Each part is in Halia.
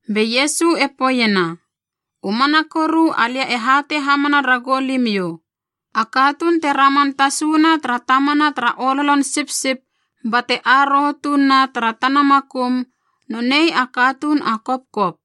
Be Iesu e poeiena, “U mana koru alia e hatei hamana ragou limiou, a katuun te raman tasuna tara tamana tara ololon sipsip bate aroho tuun na tara tana makum, nonei a katuun a kopkop.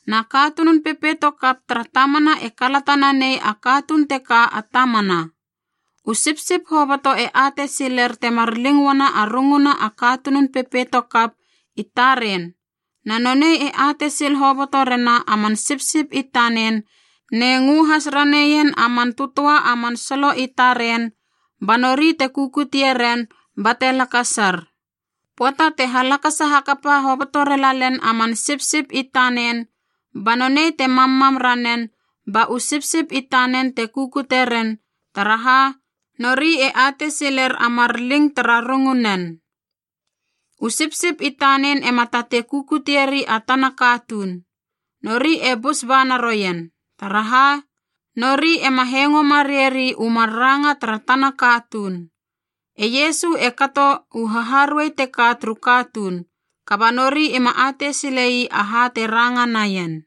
Na katunun pepeito kap tara tamana e kalata nanei a katuun teka a tamana. U sipsip hoboto e atei siler temar ling uana a runguna a katunun pepeito kap i taren, na nonei e atei sil hoboto rena a man sipsip i tanen ne ngö has raneien a man tötöa a man solo i taren ba nori te kukutie ren bate lakasar. Pöata te halakasa hakapa hoboto relalen a man sipsip i tanen ba nonei te mammam ranen ba u sipsip i tanen te kukute ren taraha nori e atei siler a mar ling tara rungunen. U sipsip i tanen ema tatei kukutieri a tana katuun, nori e bus ba naroien, taraha nori ema hengo mareieri u mar ranga tara tana katuun.” E Iesu e kato u haharuei teka turu katuun, kaba nori ima atei sile ii aha te ranga naien.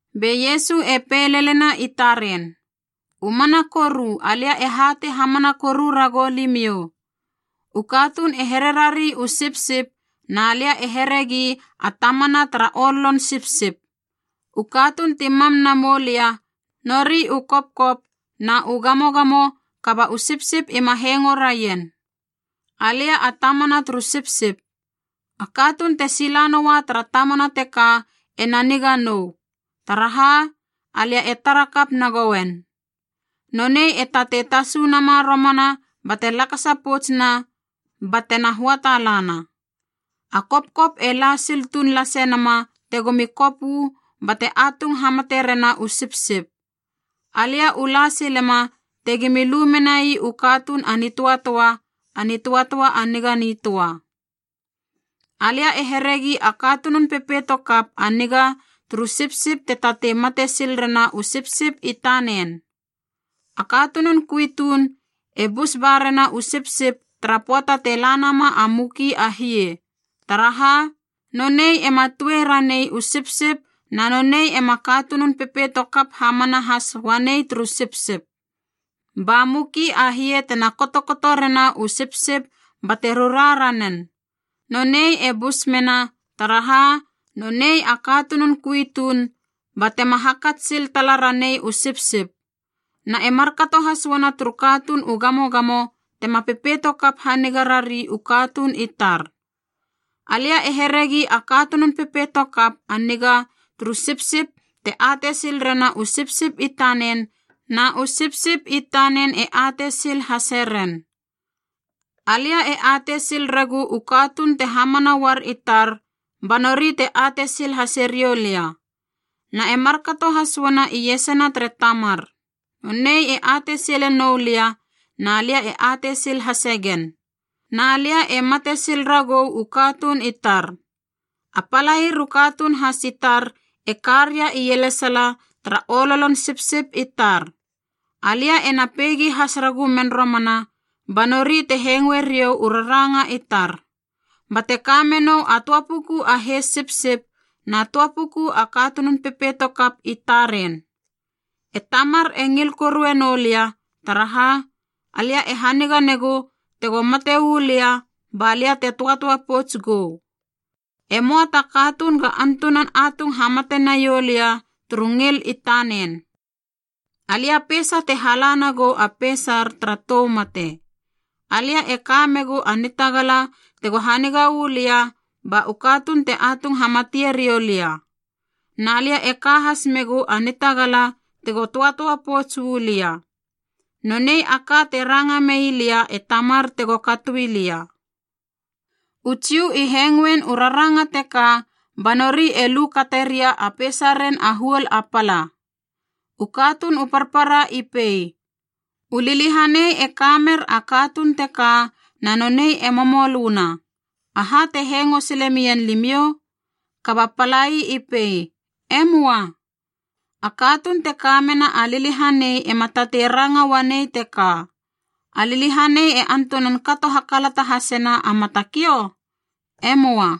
Be Iesu e pei lelena i taren, “U mana koru alia e hatei hamana koru ragou limiou, u katuun e hererari u sipsip na lia e heregi a tamana tara ololon sipsip. U katuuna ti mam na moulia, nori u kopkop na u gamogamo kaba u sipsip ima hengo raien. Alia a tamana turu sipsip. A katuun te sila noua tara tamana teka ena niga nou, taraha alia e tara kap nagouen. Nonei e tatei tasu nama romana bate lakasa poutsuna batena höata lana. A kopkop e la sil tuun lase nama tegomi kop uu bate atung hamate rena u sipsip. Alia u la silema tegimi lu menai u katuun a nitöatöa, a nitöatöa a niga nitöa. “Alia e heregi a katunun pepeito kap a niga turu sipsip te tatei mate sil rena u sipsip i tanen. A katunun kui tuun e bus ba rena u sipsip tara pöata te la nama a muki a hie, taraha nonei ema tue ranei u sipsip na nonei ema katunun pepeito kap hamana has uanei turu sipsip. Ba muki a hie tena kotokoto rena u sipsip bate rura ranen. Nonei e busmena, taraha nonei a katunun kui tuun batema hakats sil tala ranei u sipsip. Na e markato has uana turu katuun u gamogamo tema pepeito kap haniga rari u katuun i tar. “Alia e heregi a katunun pepeito kap a niga turu sipsip te atei sil rena u sipsip i tanen na u sipsip i tanen e atei sil hase ren. Alia e atei sil regu u katuun te hamana uar i tar ba nori te atei sil hase riou lia. Na e markato has uana iesana tere Tamar. Nonei e atei sile noulia na lia e atei sil hase gen. Na lia e mate sil ragou u katuun i tar. A palair u katuun has i tar e ka ria ielesala tara ololon sipsip i tar. Alia ena peigi has ragumen romana ba nori te hengoe riou u raranga i tar. Bate ka menou a töa puku a heis sipsip na töa puku a katunun pepeito kap i taren. E Tamar e ngil korue noulia, taraha alia e haniga negu tego mate uu lia ba lia te töatöa pouts gou. E möa ta katuun ga antunan atung hamate naiou lia turu ngil i tanen. Alia peisa te hala nagou a peisar tara tou mate. Alia e ka megu a nitagala tego haniga uu lia ba u katuun te atung hamatie riou lia, na lia e ka has megu a nitagala tego töatöa pouts uu lia. Nonei a ka te ranga mei lia e Tamar tego katoi lia.” U Jiu i hengoein u raranga teka ba nori e lu kate ria a peisaren a huol a pala. U katuun u parpara i pei, “U liliahanei e ka mer a katuun teka na nonei e momolöna. Aha te hengo sile mien limiou?” Kaba palai i pei, “E möa. A katuun te ka mena a liliahanei ema tatei ranga uanei teka. A liliahanei e antunan kato hakalata hasena a matakiou? E möa!”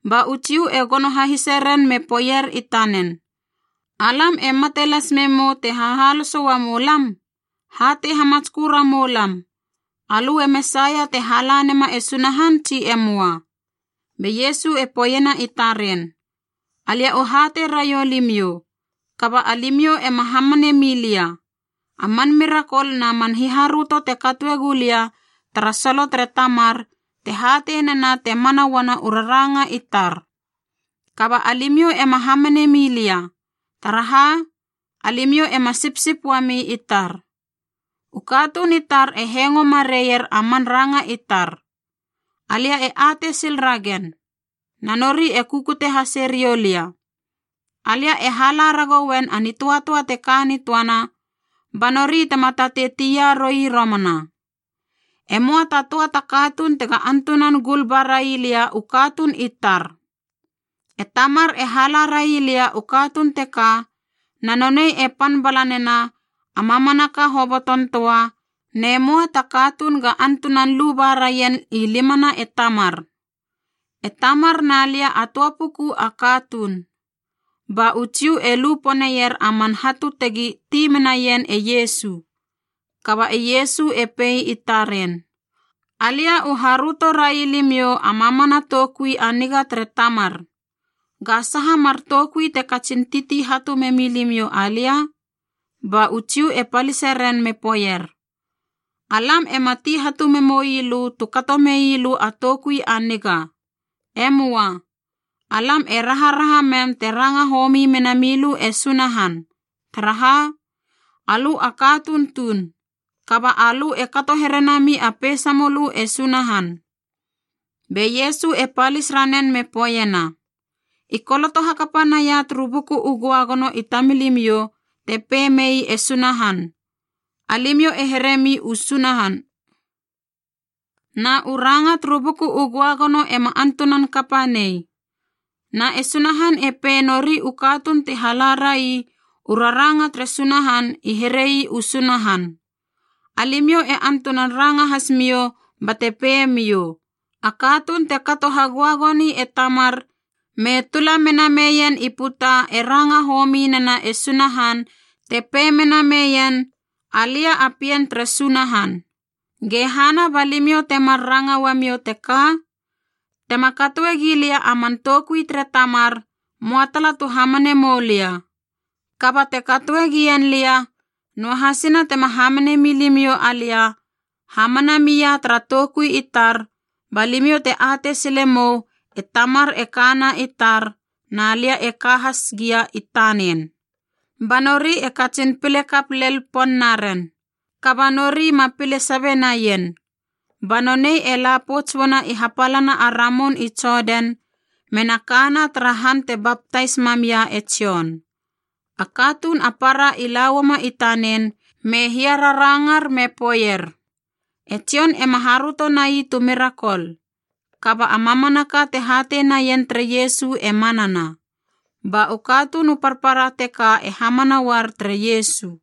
Ba u Jiu e gono hahise ren me poeier i tanen, “Alam e mate las memou te hahaloso uamou lam. Hatei hamatskö ramou lam, alö e Mesaia te hala nema e Sunahan tsi e möa?” Be Iesu e poeiena i taren, “Alia u hatei raiou limiou, kaba alimiou ema hamane milia. A man mirakol na man hiharöto te katoe gulia tara solo tere Tamar te hatei nena te mana uana u raranga i tar. Kaba alimiou ema hamane milia, taraha a limiou ema sipsip uami i tar. U katuun i tar e hengo mareier a mar ranga i tar. Alia e atei sil ragen, na nori e kukute hase riou lia. Alia e hala ragouen a nitöatöa te ka nitöana ba nori tema tatei tia roi romana. E möa ta töa ta katuun tega antunan gul ba rai lia u katuun i tar. E Tamar e hala rai lia u katuun teka na nonei e pan bala nena a mamanaka hoboton töa ne möa ta katuun ga antunan lu baraien i limana e Tamar. E Tamar na lia a töa puku a katuun.” Ba u Jiu e lu poneier a man hatu tegi ti menaien e Iesu. Kaba e Iesu e pei i taren, “Alia u haröto rai limiou a mamana toukui a niga tere Tamar. Ga saha mar toukui te katsin titi hatu memi limiou alia?” Ba u Jiu e palise ren me poeier, “Alam ema ti hatu memoi lö tu kato mei lö a toukui a niga. E möa. Alam e raharaha mem te ranga homi mena milö e Sunahan. Taraha, alö a katuun tuun, kaba alö e kato here nami a peisamölö e Sunahan.” Be Iesu e palis ranen me poeiena, “I koloto hakapa naia turu Buku u Göagono i tamilimiou te pei mei e Sunahan, ‘Alimiou e heremi u sunahan.’ Na u ranga turu Buku u Göagono ema antunan kapa nei. Na e Sunahan e pei nori u katuun ti halarai u raranga tere Sunahan i herei u sunahan. Alimiou e antunan ranga hasimiou bate peimiou, a katuun te kato hagöagoni e Tamar me tula mena meien i puta e ranga homi nena e Sunahan te pei mena neien, ‘Alia a Pien tere Sunahan.’ Ge hana ba limiou te mar ranga uamiou teka? Tema katoe gi lia a man toukui tere Tamar, möa tala tu hamane moulia. Kaba te katoegien lia, noahasina tema hamane milimiou alia, hamana mia tara toukui i tar ba limiou te atei sile mou e Tamar e kana i tar na lia e ka has gia i tanen.” Ba nori e katsin pile kap lel pon naren, kaba nori ma pile sabe naien. Ba nonei e la pouts uana i hapalana a Ramun i Jodan mena kana tara han te baptais mam ia e Jon. A katuun a para i lauama i tanen me hiararangar me poeier, “E Jon ema haröto nai tu mirakol, kaba a mamanaka te hatei naien tere Iesu e manana.” Ba u katuun u parpara teka e hamana uar tere Iesu.